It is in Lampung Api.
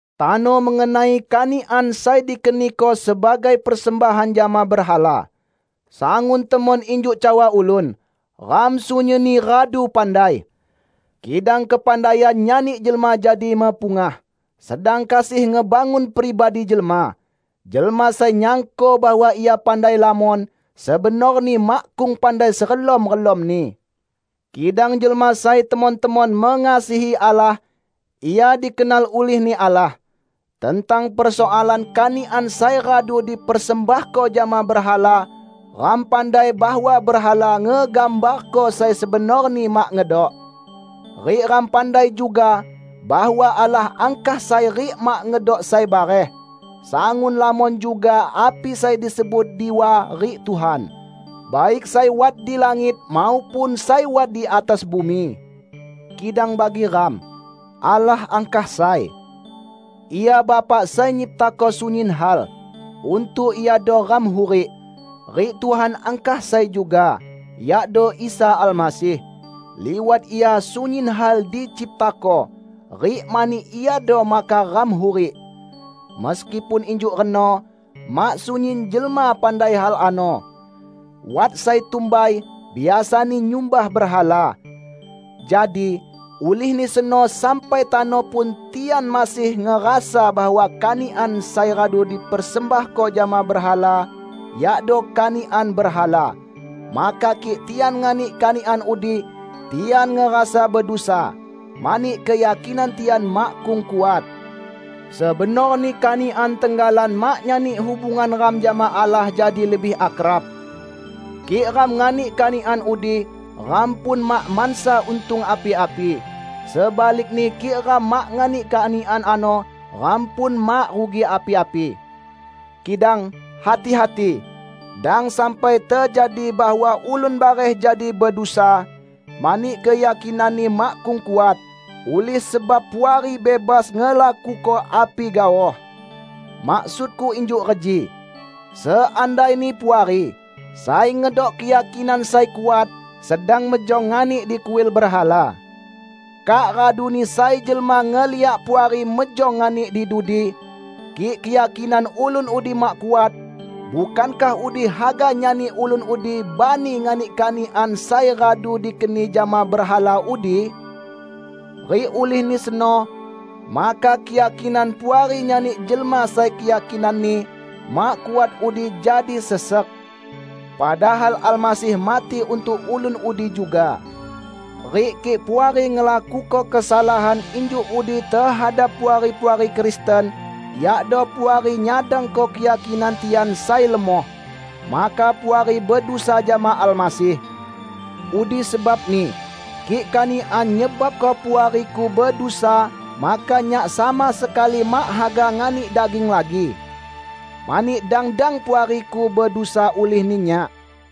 Tano mengenai kanikan sai dikeniko sebagai persembahan jama berhala. Sangun temon injuk cawa ulun, "Ram sunyinni radu pandai." Kidang kepandaian nyani jelma jadi mepungah, sedang kasih ngebangun pribadi jelma. Jelma sai nyangko bahwa ia pandai lamon, sebenorni makkung pandai serelom-relomni. Kidang jelma sai temon-temon mengasihi Allah, ia dikenal ulih-Ni Allah. Tentang persoalan kanikan sai radu dipersembahko jama berhala, ram pandai bahwa berhala ngegambarko sai sebenorni mak ngedok. Rik ram pandai juga bahwa Allah angkah sai rik mak ngedok sai bareh. Sangun lamon juga api sai disebut diwa rik tuhan; baik sai wat di langit maupun sai wat di atas bumi. Kidang bagi ram, Allah angkah sai. Ia Bapa sai nyiptako sunyin hal. Untuk Iado ram hurik. Rik Tuhan angkah sai juga, yakdo Isa Almasih. Liwat Ia sunyin hal diciptako, rik mani Iado maka ram hurik. Meskipun injuk reno, mak sunyin jelma pandai hal ano. Wat sai tumbai biasani nyumbah berhala. Jadi, ulihni seno sampai tano pun tian masih ngerasa bahwa kanikan sai radu dipersembahko jama berhala, yakdo kanikan berhala. Maka kik tian nganik kanikan udi, tian ngerasa bedusa; mani keyakinan tian makkung kuat. Sebenorni kanikan tenggalan mak nyani hubungan ram jama Allah jadi lebih akrab. Kik ram nganik kanikan udi, ram pun mak mansa untung api-api. Sebalikni kik ram mak nganik kanikan ano, ram pun mak rugi api-api. Kidang, hati-hati! Dang sampai tejadi bahwa ulun bareh jadi bedusa -- mani keyakinanni makkung kuat -- ulih sebab Puari bebas ngelakuko api gaoh. Maksudku injuk reji: Seandaini Puari, sai ngedok keyakinan sai kuat, sedang mejong nganik di kuil berhala. Kak raduni sai jelma ngeliak Puari mejong nganik di dudi. Kik keyakinan ulun udi mak kuat, bukankah udi haga nyani ulun udi bani nganik kanikan sai radu dikeni jama berhala udi? Rik ulihni seno, maka keyakinan Puari nyani jelma sai keyakinanni mak kuat udi jadi sesek. Padahal Almasih mati untuk ulun udi juga. Rik kik Puari ngelakuko kesalahan injuk udi tehadap puari-puari Kristen -- yakdo Puari nyadangko keyakinan tian sai lemoh -- maka Puari bedusa jama Almasih. Udi sebabni, kik kanikan nyebabko puariku bedusa, maka nyak sama sekali mak haga nganik daging lagi. Mani dang-dang puariku bedusa ulihni nyak.